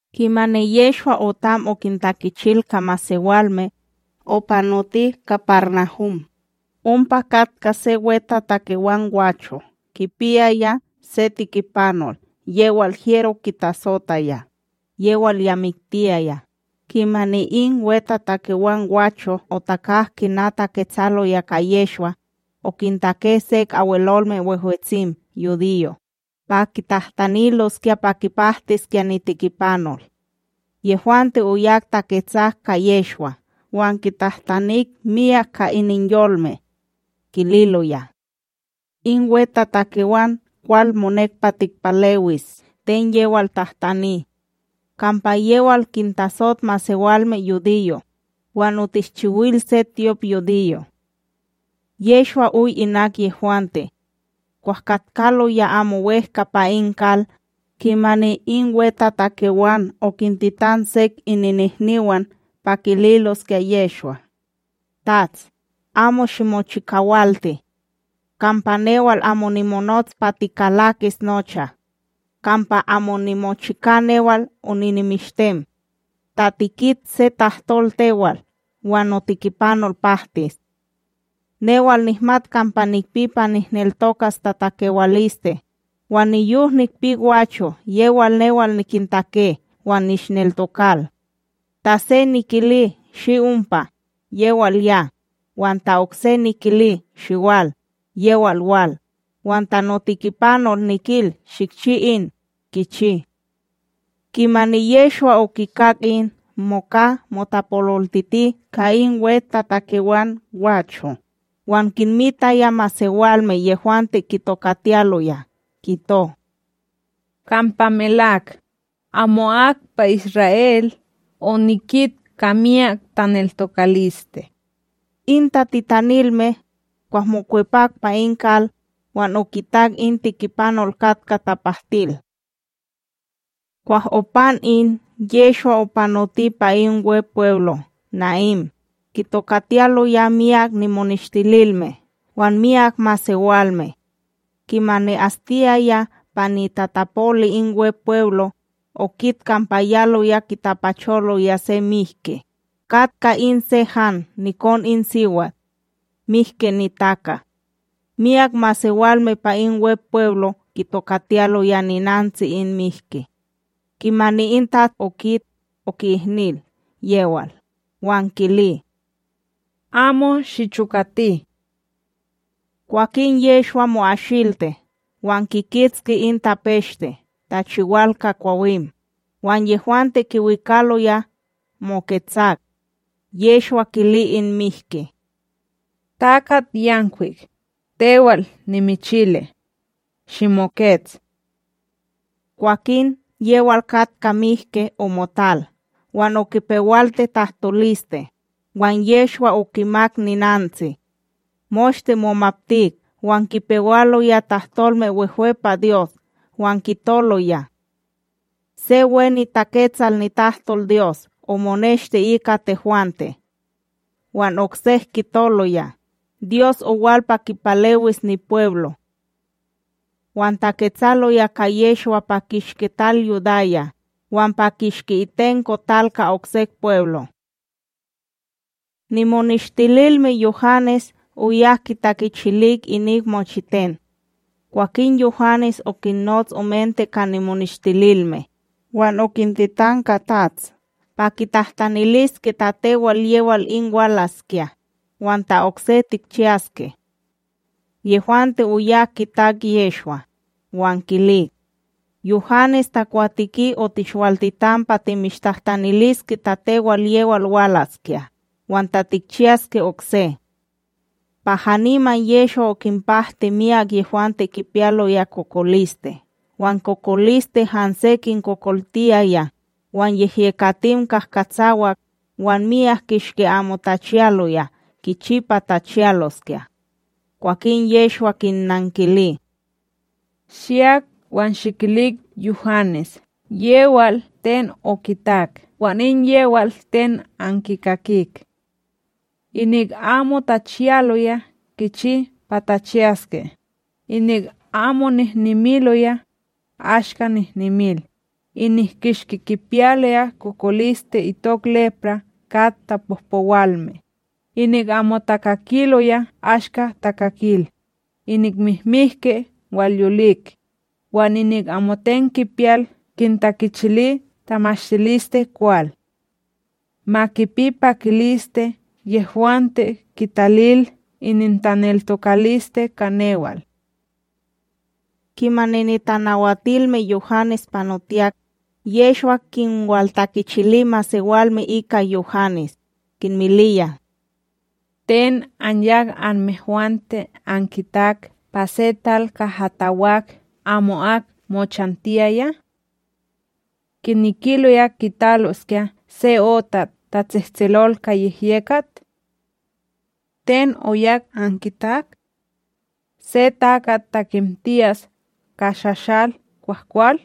Kimani Yehshwa otam okintakichil ka masewalme, opanoti KaparNahum. Ompa katka se wetatakewan gwacho kipiyaya se tikipanol yewal hyero kitatsotaya, yewal miktiyaya. Kimani in wetatakewan gwacho otakak kina taketsaloya ka Yehshwa, okintake sek Abwelolme Wehwetsim yudiyo' pa kitahtaniloskya pa kipahtiskya nitikipanol. Yehwante oyak taketsak ka Yehshwa wan kitahtanik miyak ka ininyolme, kililoya: ―In wetatakewan kwal monek pa tikpalewis ten yewal tahtani; kampa yewal kintasot masewalme yudiyo', wan otishchiwil se tyopYudiyo. Yehshwa oy inak yehwante. Kwah katkaloya amo wEhka pa in kal, kimani in wetatakewan okintitan sek ininihniwan pa kililoskya Yehshwa: ―Tats, amo shimochikawalti, kampa newal amo nimonots pa tikalakis nocha; kampa amo nimochika newal oninimishtem. Ta tikit se tahtol tewal, wan notikipanol pahtis. Newal nihmat kampa nikpi pa nihneltokas tatakewaliste, wan niyok nikpi gwacho' yewal newal nikintake wan nishneltokal. Ta se nikili shi ompa, yewal ya; wan ta okse nikili shiwal, yewal wal; wan ta notikipanol nikil shikchi in, kichi. Kimani Yehshwa okikak in, moka motapololtiti ka in wetatakewan gwacho, wan kinmitaya masewalme yehwante kitokatiyaloya kito: ―Kampa melak, amo'ak pa Isra'El onikit ka miyak taneltokaliste. In tatitanilme, kwah mokwepak pa in kal, wan okitak in tikipanol katka tapahtil. Kwah opan in, Yehshwa opanoti pa in Wepweblo Na'ín, kitokatiyaloya myak nimoneshtililme wan myak masewalme. Kimani astiyaya pa nitatapoli in Wepweblo, okit kampa yaloya kitapacholoya se mihki, katka in se han nikon in siwat, mihki nitaka. Myak masewalme pa in Wepweblo kitokatiyaloya ninantsi in mihki. Kimani in TATS okit, oki'ihnil yewal, wan kili: ―Amo shichokati. Kwakin Yehshwa mo'ashilti wan kikitski in tapeshte tachiwal ka kwawim; wan yehwante kiwikaloya moketsak. Yehshwa kili in mihki: ―TakatYankwik, tewal nimichili: Shimokets! Kwakin yewal katkaya mihki omotal wan okipewalti tahtoliste, wan Yehshwa okimak ninantsi. Moshte momaptik wan kipewaloya tahtolme wehwe pa Dyos, wan kitoloya: ―Se we niTaketsal nitahtolDyos omoneshti ika tehwante. Wan oksek kitoloya: ―Dyos owal pa kipalewis nipweblo. Wan taketsaloya ka Yehshwa pa kishki tal Yudaya wan pa kishki itenko tal ka oksek pweblo'. Nimoneshtililme Yuhanes oyak kitakichilik inik mochiten. Kwakin Yuhanes okinnots omente ka nimoneshtililme, wan okintitan ka TATS pa kitahtaniliske ta tewal yewal in walaskya, wan ta okse tikchiyaske. Yehwante oyak kitak Yehshwa, wan kilik: ―Yuhanes takwateki otishwaltitan pa timishtahtaniliske ta tewal yewal walaskya, wan ta tikchiyaske okse. Pa haniman Yehshwa okinpahti myak yehwante kipiyaloya kokoliste wan kokoliste hanse kinkokoltiyaya, wan yehyekatim kahkatsawak, wan myak kishki amo tachiyaloya kichi pa tachiyaloskya. Kwakin Yehshwa kinnankili: ―Shiyak wan shikilik Yuhanes yewal ten okitak wan in yewal ten ankikakik. Inik amo tachiyaloya kichi pa tachiyaske, inik amo nehnemiloya, ashka nehnemil, inik kishki kipiyalo kokoliste itok lepraa kat tapohpowalme, inik amo takakiloya ashka takakil, inik mihmihki walyolik, wan inik amoten kipiyal kintakichili tamashtilisteKwal. Ma kipi pakiliste yehwante kitalil inintaneltokaliste ka newal. Kimani nitanawaltilme Yuhanes panotiyak, Yehshwa kinwaltakichili masewalme ika Yuhanes, kinmiliya: ―Ten anyak anmehwante ankitak pa se tal kaha takwak amo'ak mochantiyaya? Kinekiloya kitaloskya se otat tatsehtselol ka yehyekat? Ten oyak ankitak? Se takat takemtiyas ka shashal kwahkwal?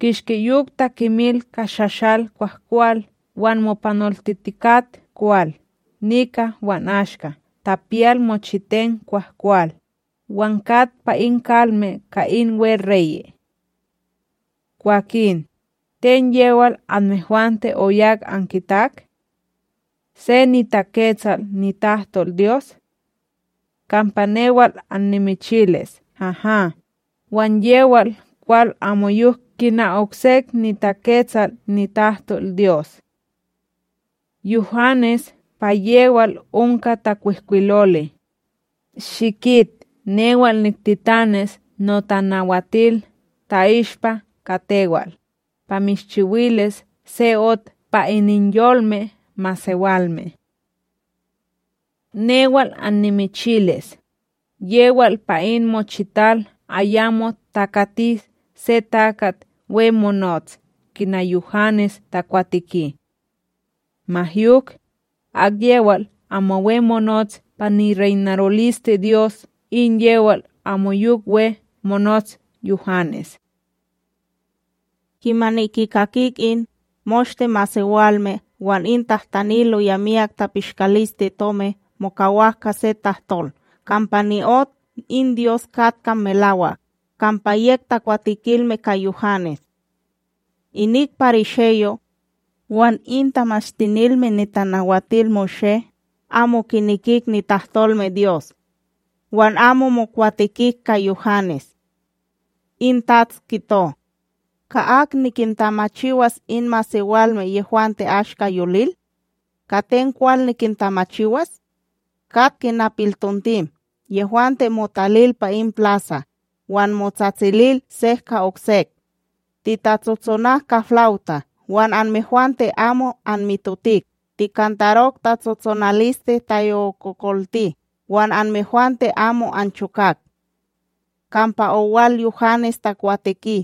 Kishki yok takemil ka shashal kwahkwal wan mopanoltitikat kwal nika wan ashka tapiyal mochiten kwahkwal, wan kat pa in kalme ka in weReye'. Kwakin, ten yewal anmehwante oyak ankitak? Se niTaketsal nitahtolDyos? Kampa newal amnimichilis haha, wan yewal kwal amoyok kina oksek niTaketsal nitahtolDyos. Yuhanes pa yewal onka takwihkwiloli: Shikit newal niktitanis notanawatil ta'ishpa ka tewal, pa mishchiwilis se ot pa ininyolme masewalme. Newal annimichilis, yewal pa in mochital ayamo takati se takat we monots kina Yuhanes takwateki; ma yok, akyewal amo we monots pa nireynarolisteDyos in yewal amoyok we monots Yuhanes. Kimani kikakik in, moshte masewalme wan in tahtaniloya miyak tapishkalisteTomi mokawak ka se tahtol kampa ni'ot in Dyos katka melawak, kampa yek takwatekilme ka Yuhanes; inik parisheyo' wan in Tamashtinilme NitanawatilMoshé, amo kinekik nitahtolmeDyos wan amo mokwatekik ka Yuhanes. In Tats kito: ―Ka ak nikintamachiwas in masewalme yehwante ashka yolil? Ka ten kwal nikintamachiwas? Kat kina piltontim yehwante motalil pa in plasa' wan motsatsilil sek ka okse: “Titatsotsonak ka flawta wan anmehwante amo anmitotik; tikantarok tatsotsonaliste tayokokolti wan anmehwante amo anchokak.” Kampa owal Yuhanes takwateki,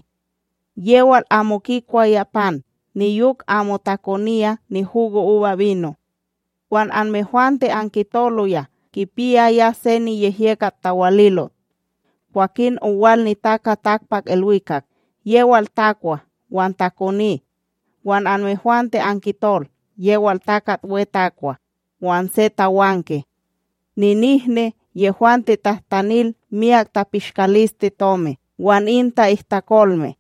yewal amo kikwaya pan niyok amo takoniya nihugoUbaBino, wan anmehwante ankitoloya kipiyaya se niyehyekat tawalilot. Kwakin owal NitakaTakpakIlwikak, yewal takwa wan takoni, wan anmehwante ankitol yewal takat we takwa wan se tawanke, ninihni yehwante tahtanil miyak tapishkalisteTomi wan in ta'ihtakolme.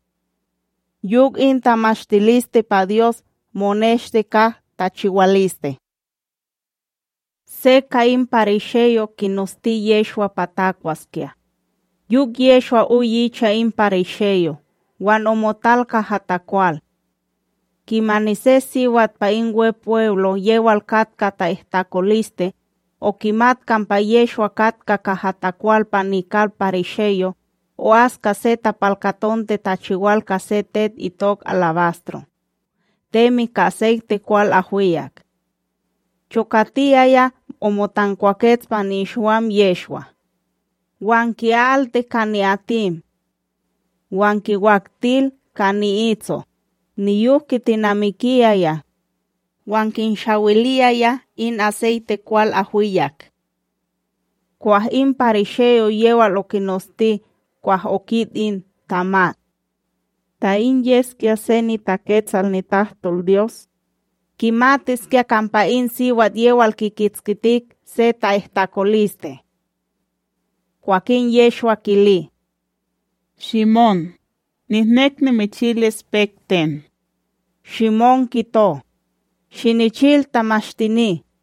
Yok in tamatiliste pa Dyos moneshti ka tachiwaliste. Se ka in parisheyo' kinosti Yehshwa pa takwaskya, yok Yehshwa oy icha in parisheyo wan omotal kaha takwal. Kimani se siwat pa in Wepweblo yewal katka ta'ihtakoliste, okimat kampa Yehshwa katka kaha takwal pa nikal parisheyo, o'as ka se tapalkatonte tachiwal ka se tet itok alabastro temi ka aseyte kwal ahwiyak. Chokatiyaya omotankwakets pa nikshiwam Yehshwa wan ki'alti ka ni'atim. Wan kinwaktil ka ni'itso, niyok kitinamikiyaya wan kinshawiliyaya in aseyte kwal ahwiyak. Kwah in parisheyo yewal okinosti kwah okit in, tamat: “Ta in yeskya se niTaketsal nitahtolDyos, kimatiskya kampa in siwat yewal kikitskitik se ta'ihtakoliste.” Kwakin Yehshwa kili: ―Shimón, nihnek nimichilis pek ten. Shimón kito: ―Shinichil, tamashtini.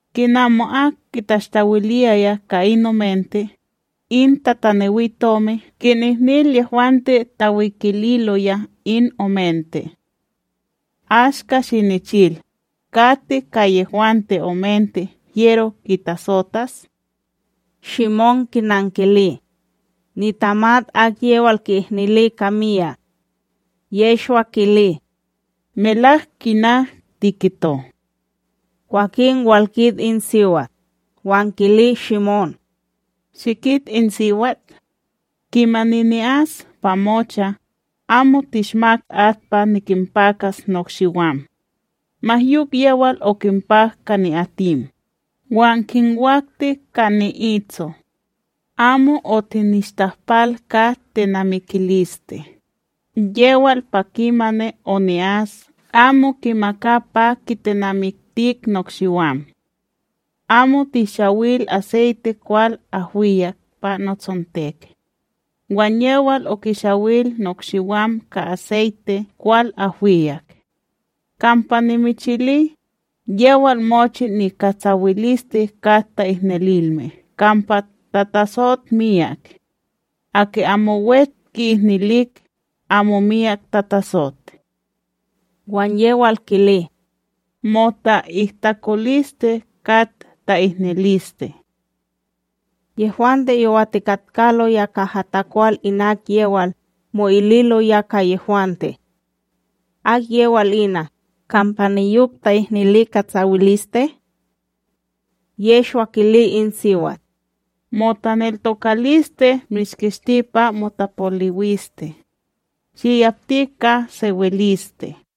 Kina amo'ak kitashtawiliyaya ka in omente, in tatanewiTomi kinihnil yehwante tawikililoya in omente. Ashka shinichil, kati ka yehwante omente hyero kitasotas? Shimón kinankili: ―Nitamat akyewal ki'ihnili ka miyak. Yehshwa kili: ―Melak kina tikito. Kwakin walkit in siwat, wan kili Shimón: ―Shikit in siwat? Kimani ni'as pa mocha, amo tishmak at pa nikinpakas nokshiwam; ma yok yewal okinpak ka ni'atim, wan kinwakti ka ni'itso. Amo otinishtahpal ka tenamikiliste, yewal pa kimani oni'as amo kimaka pa kitenamiktik nokshiwam. Amo tihshawil aseyte kwal ahwiyak pa notsontek; wan yewal okishawil nokshiwam ka aseyte kwal ahwiyak. Kampa nimichili, yewal mochi nikatsawiliste kat ta'ihnililme kampa tatatsot miyak; aki amo we ki'ihnilik, amo miyak tatatsot. Wan yewal kili: ―Mota'ihtakoliste kat ta'ihniliste. Yehwante yowatikatkaloya kaha takwal inak yewal, mo'ililoya ka yehwante: ―Akyewal ina, kampa niyok ta'ihnili katsawiliste? Yehshwa kili in siwat: ―Motaneltokaliste mishkishti pa motapoliwiste; shiyapti ka sewiliste.